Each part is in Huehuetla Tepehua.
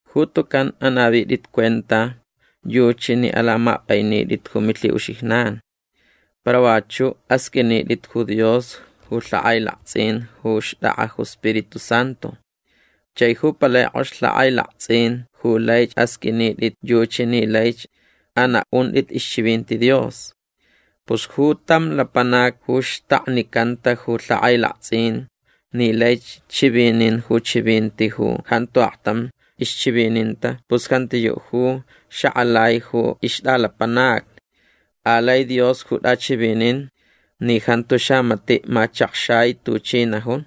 Ju tucan anavitʼit cuenta yuchi ni alamapʼainitʼit ju milhiʼuxijnan. Para vachuʼ asqʼuinitʼit ju Dios ju lhakʼailaktsʼin ju xtʼakʼa ju Spiritu Santu. Chai ju palai kʼox lhakʼailaktsʼin ju laich asqʼuinitʼit yuchi ni laich anaʼuntʼit ixchivinti Dios. Pus ju tam lapanac ju xtaknicanta ju lhakʼailaktsʼin ni laich chivinin ju chivinti ju jantu aktam ixchivininta pus jantiyuʼ ju xakʼalai ju ixtʼalapanacni. Alai Dios ju tʼachivinin ni jantu xamatiʼ machakxai tuchi najun.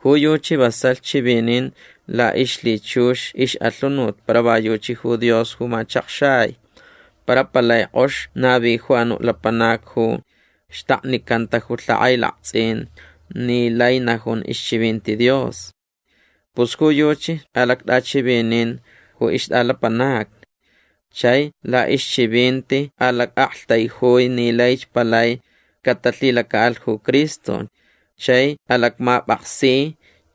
Ju yuchi vasalh chivinin laʼixlhichux ixʼalhunut para va yuchi ju Dios ju machakxai. Para palai kʼox navi ju anuʼ lapanac ju xtaknicanta ju lhakʼailaktsʼin ni lai najun ixchivinti Dios. Pus ju yuchi alactʼachivinin ju ixtʼalapanacni. Chai laʼixchivinti alacʼaktaijui ni laich palai catalhilacaʼalh ju Cristo chai alacmapʼaksi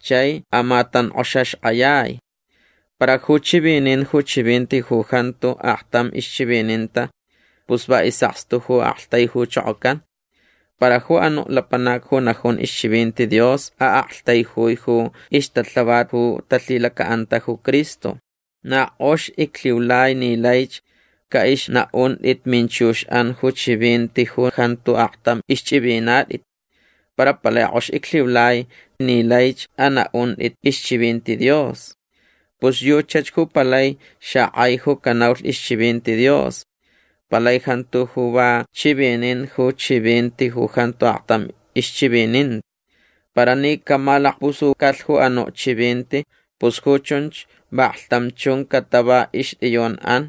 chai amatankʼoxaxkʼayai. Para ju chivinin ju chivinti ju jantu aktam ixchivininta pus va isʼakstu ju aktaijuchokocan. Para ju anuʼ lapanac ju najun ixchivinti Dios aʼaktaijui ju ixtalhavat ju talhilacaʼanta ju Cristo. Na kʼox iclhiulai ni laich caʼixnaʼuntʼit minchuxʼan ju chivinti ju jantu aktam ixchʼivinatʼit. Para palai kʼox iclhiulai ni laich anaʼuntʼit ixchivinti Dios. Pus yuchach ju palai xakʼai ju canaulh ixchivinti Dios. Palai jantu ju va chivinin ju chivinti ju jantu aktam ixchivininta. Para ni camalakpusucalh ju anuʼ chivinti pus ju chunch vaklhtam chun catava ixtʼiyunʼan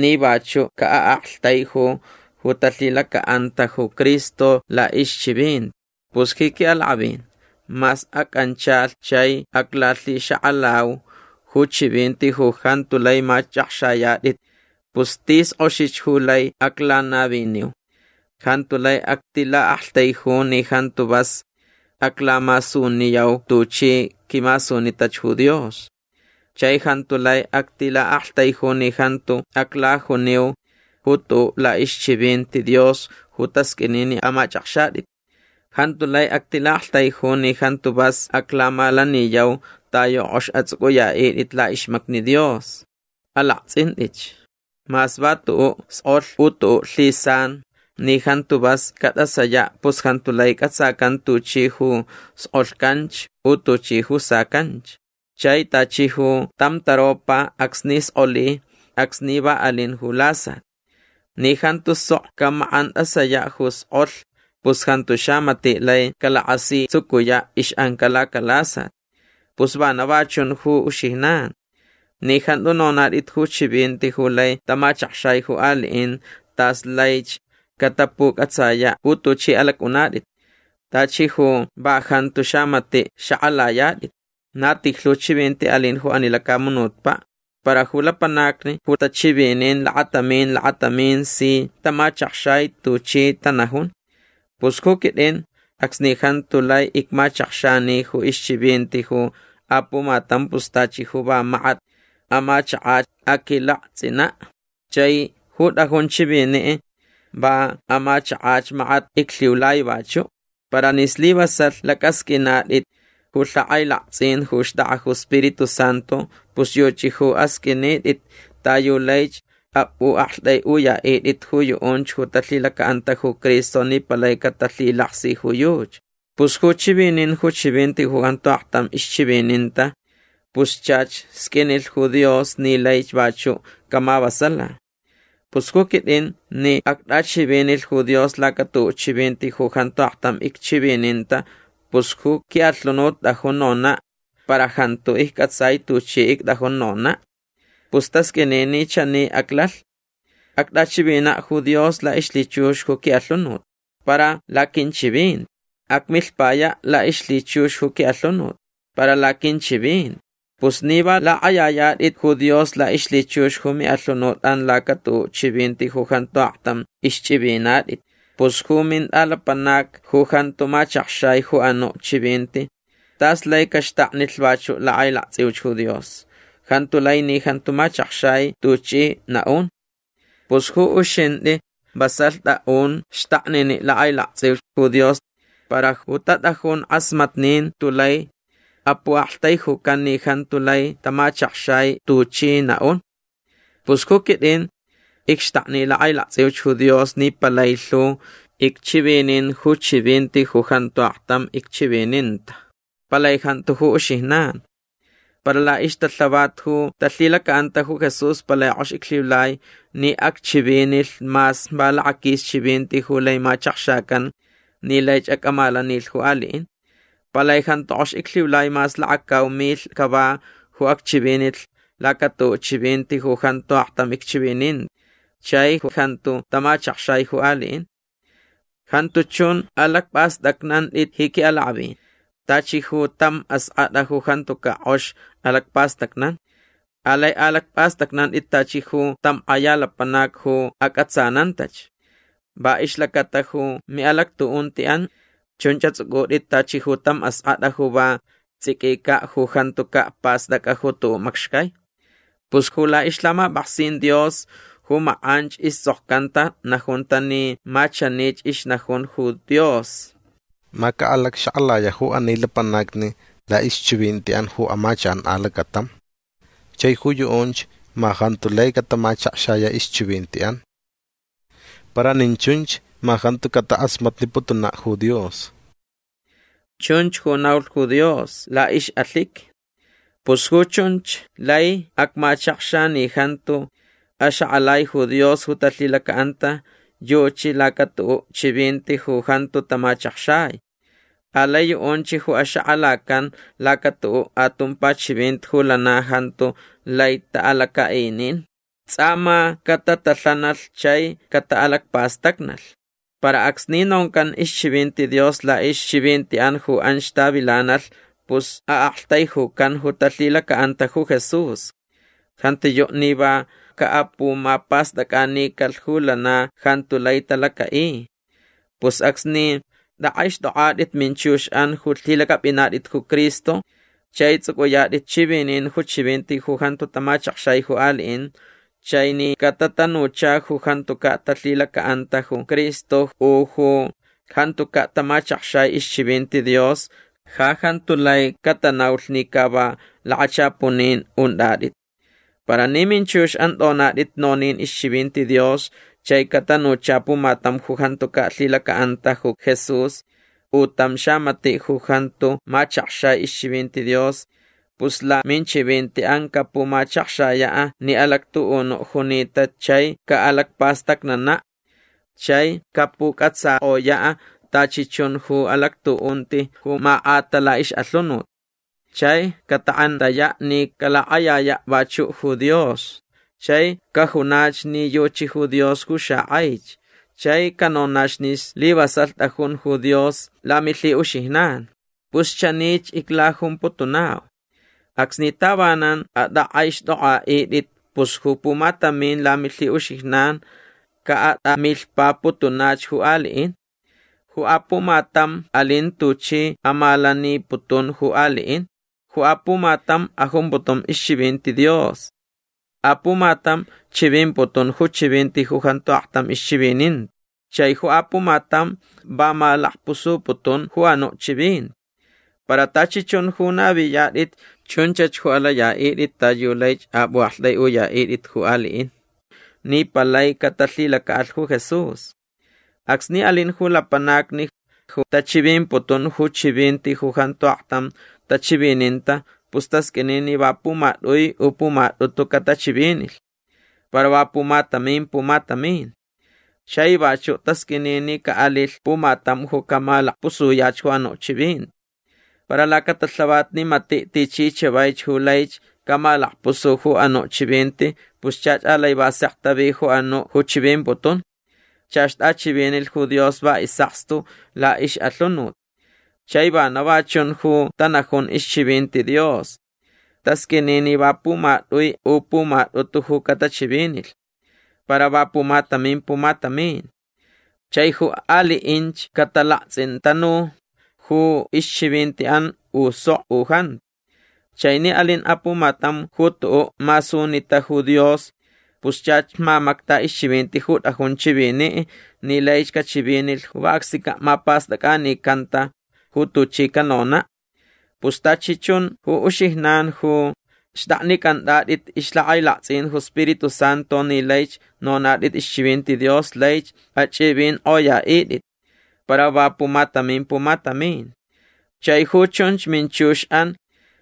ni vachuʼ caʼaʼaktaiju ju talhilacaʼanta ju Cristo laʼixchivinti. Pus ji quiʼalakʼavin mas acʼanchalh chai aclalhixakʼalau ju chivinti ju jantu lai machʼakxayatʼit pus tis kʼoxich ju lai aclanaviniu. Jantu lai actilaʼaktaiju ni jantu vas aclamasuniyau tuchi quimasunitach ju Dios. Chai jantu lai actilaʼaktaiju ni jantu aclajuniu ju tuʼuʼ laʼixchivinti Dios ju tasqʼuini ni amachʼakxatʼit. Jantu lai actilaʼaktaiju ni jantu vas aclamalaniyau ta yu kʼox atsʼucʼuyaʼitʼit laʼixmacni Dios. Alaktsʼintʼitch. Mas va tuʼuʼ skʼolh u tuʼuʼ lhisan ni jantu vas catʼasayaʼ pus jantu lai cʼatsacan tuchi ju skʼolhcanch u tuchi ju sacanch. Chai tachi ju tam taropa acsni skʼoli acsni va alin ju lasat. Ni jantu sok camakʼantʼasayaʼ ju iskʼolh pus jantu xamatiʼ lai calakasitsucuyaʼ ixʼanca lacalasat. Pus vana va chun ju uxijnan. Ni jantu nonatʼit ju chivinti ju lai tamachakxai ju aliʼin tas laich catapucʼatsayaʼ ju tuchʼi alacʼunatʼit. Tachi ju va jantu xamatiʼ xakʼalayatʼit. Na tijlhu chivinti alin ju ani lacamunutpaʼ para ju lapanacni ju tachivinin lakatamin lakatamin si tamachakxai tuchi tanajun. Pus ju quitʼin acsni jantu lai icmachakxani ju ixchivinti ju apumatam pus tachi ju va makat amachakach aquilaktsʼinaʼ. Chai ju tʼajun chiviniʼ va amachakach makat iclhiulai vachuʼ. Para ni slivasalh lacʼasqʼuinatʼit ju lhakʼailaktsʼin ju xtʼakʼa ju Spiritu Santu pus yuchi ju asqʼuinitʼit ta yu laich apʼuʼaktʼaiʼuyaʼitʼit ju yuʼunch ju talhilacaʼanta ju Cristo ni palai catalhilaksi ju yuchi. Pus ju chivinin ju chivinti ju jantu aktam ixchivininta pus chach sqʼuinilh ju Dios ni laich vachuʼ camavasala. Pus ju quitʼin ni actʼachivinilh ju Dios laca tuʼuʼ chivinti ju jantu aktam icchivininta pus ju quiʼalhunut tʼajun nonaʼ para jantu iccʼatsai tuchi ictʼajun nonaʼ. Pus tasqʼuini ni chani aclalh. Actʼachivinaʼ ju Dios laʼixlhichux ju quiʼalhunut. Para laquinchivinti. Acmilhpayaʼ laʼixlhichux ju quiʼalhunut. Para laquinchivinti. Pus ni va lakʼayayatʼit ju Dios laʼixlhichux ju miʼalhunutʼan laca tuʼuʼ chivinti ju jantu aktam ixchʼivinatʼit pus ju mintʼalapanac ju jantu machakxai ju anuʼ chivinti tas laich caxtaknilh vachuʼ lakʼailaktsʼiuch ju Dios. Jantu lai ni jantu machakxai tuchʼi naʼun. Pus ju uxintʼi vasalh tʼaʼun xtakniniʼ lakʼailaktsʼiuch ju Dios para ju tatʼajun kʼasmatnin tulai apuʼaktaijucan ni jantu lai tamachakxai tuchʼi naʼun. Pus ju quitʼin icxtakni lakʼailaktsʼiuch ju Dios ni palai lhu icchivinin ju chivinti ju jantu aktam icchivininta. Palai jantu ju uxijnan. Para laʼixtalhavat ju talhilacaʼanta ju Jesús palai kʼox iclhiulai ni acchivinilh mas va lakaquis chivinti ju lai machakxacan ni laich acʼamalaninilh ju aliʼin. Palai jantu kʼox iclhiulai mas lakacau milh cava ju acchivinilh lacatuʼuʼ chivinti ju jantu aktam icchivininta chai ju jantu tamachakxai ju aliʼin. Jantu chun alacpʼastʼacnantʼit ji quiʼalakʼavin tachi ju tam askʼatʼa ju jantucaʼ kʼox alacpastacnan. Alai alacpʼastʼacnantʼit tachi ju tam kʼaya lapanac ju acʼatsanantach. Va ixlacata ju miʼalactuʼuntiʼan chunch atsʼucʼutʼit tachi ju tam askʼatʼa ju va tsʼiquicaʼ ju jantucaʼ pastʼacʼa ju tuʼuʼ macxcai. Pus ju laʼixlhamapʼaksin Dios ju makʼanch istsʼokcanta najunta ni ma chanich ixnajun ju Dios: “Ma caʼalacxakʼalayaʼ ju ani lapanacni laʼixchivintiʼan ju amachakʼan alacatam. Chai ju yuʼunch ma jantu lai catamachakxayaʼ ixchivintiʼan. Para nin chunch ma jantu catakʼasmatniputunaʼ ju Dios”. Chunch ju naulh ju Dios laʼixʼalhiqui. Pus ju chunch lai acmachakxa ni jantu axakʼalai ju Dios ju talhilacaʼanta yuchi lacatuʼuʼ chivinti ju jantu tamachakxai. Alai yuʼunch ju axakʼalacan lacatuʼuʼ atumpa chivinti ju lana jantu lai taʼalacaʼinin. Tsʼa ma catatalhanalh chai cataʼalacpastacnalh. Para acsni noncan ixchivinti Dios laʼixchivintiʼan ju anch tavilanalh pus aʼaktaijucan ju talhilacaʼanta ju Jesús. Jantiyuʼ ni va caʼapumapastʼacʼanicalh ju lana jantu lai talacaʼi. Pus acsni tʼakʼaixtʼokʼatʼit minchuxʼan ju lhilacʼapʼinatʼit ju Cristo chai tsʼucʼuyatʼit chivinin ju chivinti ju jantu tamachakxai ju aliʼin chai ni catatanucha ju jantucaʼ talhilacaʼanta ju Cristo u ju jantucaʼ tamachakxai ixchivinti Dios ja jantu lai catanaulh ni ca va lakachapunin untʼatʼit. Para ni minchuxʼan tʼonatʼit nonin ixchivinti Dios chai catanucha pumatam ju jantucaʼ lhilacaʼanta ju Jesús u tam xamatiʼ ju jantu machakxai ixchivinti Dios pus laminchivintiʼan capumachakxayaʼ ni alactuʼunuʼ junita chai caʼalacpastacnanaʼ. Chai capucʼatsakʼoyaʼ tachi chun ju alactuʼunti ju makʼata laʼixʼalhunut. Chai catakʼentayaʼ ni calakʼayayaʼ vachuʼ ju Dios chai cajunach ni yuchi ju Dios ju xakʼaich. Chai canonach ni slivasalh tʼajun ju Dios lamilhiʼuxijnan. Pus chanich iclajumputunau. Acsni tavanan atʼakʼaixtʼokʼaʼitʼit pus ju pumatamin lamilhiʼuxijnan caʼatʼamilhpaputunach ju aliʼin. Ju apumatam alin tuchi amalaniputun ju aliʼin. Ju apumatam ajumputun ixchivinti Dios. Apumatam chivimputun ju chivinti ju jantu aktam ixchivininta. Chai ju apumatam va malakpusuputun ju anuʼ chivinti. Para tachi chun ju naviyatʼit chunchach ju alayaʼitʼit ta yu laich apʼuʼaktʼaiʼuyaʼitʼit ju aliʼin ni palai catalhilacaʼalh ju Jesús. Acsni alin ju lapanacni ju tachivimputun ju chivinti ju jantu aktam tachivininta pus tasqʼuini ni va pumatʼui u pumatʼutu catachivinilh. Para va pumatamin pumatamin. Chai vachuʼ tasqʼuini ni caʼalilh pumatam ju camalakpusuyach ju anuʼ chivinti. Para lacatalhavat ni matiʼ tichi chavaich ju laich camalakpusu ju anuʼ chivinti pus chach alai va sek tavi ju anuʼ ju chivimputun. Chach tʼachivinilh ju Dios va isʼakstu laʼixʼalhunut. Chai vana va chun ju tanajun ixchivinti Dios. Tasqʼuini ni va pumatʼui u pumatʼutu ju catachivinilh. Para va pumatamin pumatamin. Chai ju aliʼinch catalaktsʼintanu ju ixchivintiʼan u sok u jantu. Chai ni alin apumatam ju tuʼuʼ masunita ju Dios pus chach mamacta ixchivinti ju tʼajun chiviniʼ ni laich cachivinilh ju va acsnicaʼ mapastʼacʼanicanta ju tuchi canonaʼ. Pus tachi chun ju uxijnan ju xtʼaknicʼantʼatʼit ixlhakʼailaktsʼin ju Spiritu Santu ni laich nonatʼit ixchivinti Dios laich achʼivinkʼoyaʼitʼit. Para va pumatamin pumatamin. Chai ju chunch minchuxʼan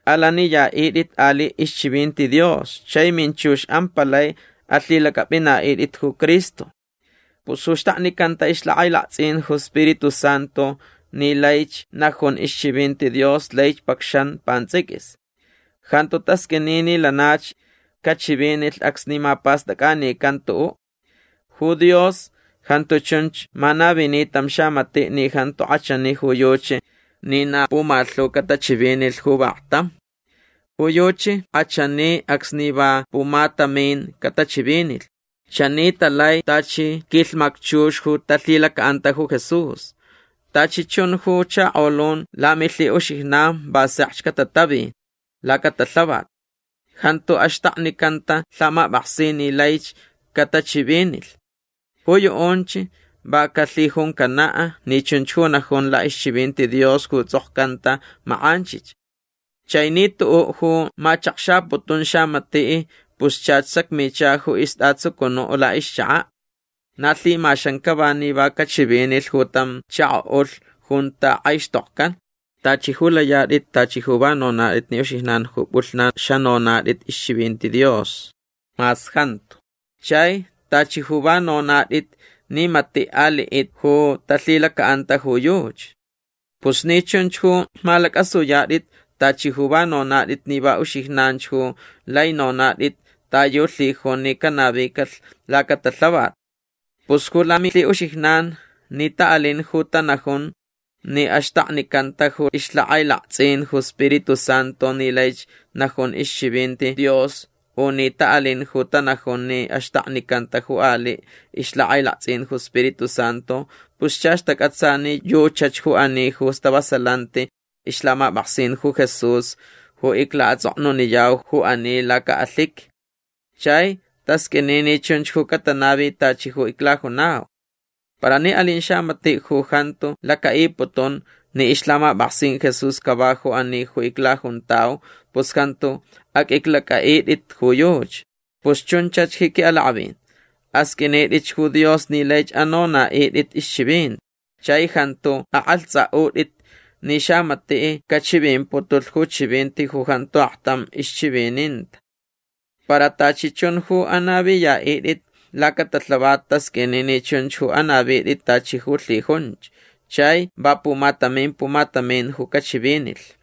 alaniyaʼitʼit aliʼ ixchivinti Dios chai minchuxʼan palai alhilacʼapʼinaʼitʼit ju Cristo. Pus ju xtaknicanta ixlhakʼailaktsʼin ju Spiritu Santu ni laich najun ixchivinti Dios laich pacxan pantsʼiquis. Jantu tasqʼuini ni lanach cachivinilh acsni mapastʼacʼanican tuʼuʼ. Ju Dios jantu chunch manavini tam xamatiʼ ni jantu kʼachani ju yuchi ni na pumalhu catachivinilh ju vaktam. Ju yuchi kʼachani acsni va pumatamin catachivinilh. Chani talai tachi quilhmacchux ju talhilacaʼanta ju Jesús. Tachi chun ju chakolun lamilhiʼuxijnan va sekch catatavi lacatalhavat. Jantu axtaknicanta lhamapʼaksin ni laich catachivinilh. Ju yuʼunch va calhijuncanaʼ ni chunch ju najun laʼixchivinti Dios ju tsʼokcanta makʼanch. Chai ni tuʼuʼ ju machakxaputun xamatiʼ pus chach sacmicha ju istʼatsucunuʼ laʼixchakaʼ. Na lhimaxan cava ni va cachivinilh ju tam chakoʼulh junta kʼaixtokcan. Tachi ju layatʼit tachi ju va nonatʼit ni uxijnan ju pʼulhnan xanonatʼit ixchivinti Dios. Mas jantu. Chai tachi ju va nonatʼit ni matiʼ aliʼitni ju talhilacaʼanta ju yuchi. Pus ni chunch ju malacʼasuyatʼit tachi ju va nonatʼit ni va uxijnan ju lai nonatʼit ta yu lhijun ni canavicalh lacatalhavat. Pus ju lamilhiʼuxijnan ni taʼalin ju tanajun ni axtaknicanta ju ixlhakʼailaktsʼin ju Spiritu Santu ni laich najun ixchivinti Dios u ni taʼalin ju tanajun ni axtaknicanta ju aliʼ ixlhakʼailaktsʼin ju Spiritu Santu pus chach tacʼatsa ni yuchach ju ani ju stavasalanti ixlhamapʼaksin ju Jesús ju iclaʼatsʼoknuniyau ju ani lacaʼalhiqui. Chai tasqʼuini ni chunch ju catanavi tachi ju iclajunau. Para ni alin xamatiʼ ju jantu lacaʼiputun ni ixlhamapʼaksin Jesús cava ju ani ju iclajuntau pus jantu aqʼuiclacʼaʼitʼit ju yuchi. Pus chunchach ji quiʼalakʼavin. Asqʼuinitʼitch ju Dios ni laich anonaʼitʼit ixchivinti. Chai jantu akʼalhtsʼaʼutʼit ni xamatiʼ cachivimputulh ju chivinti ju jantu aktam ixchivininta. Para tachi chun ju anaviyaʼitʼit lacatalhavat tasqʼuini ni chunch ju anavitʼit tachi ju lhijunch. Chai va pumatamin pumatamin ju cachivinilh.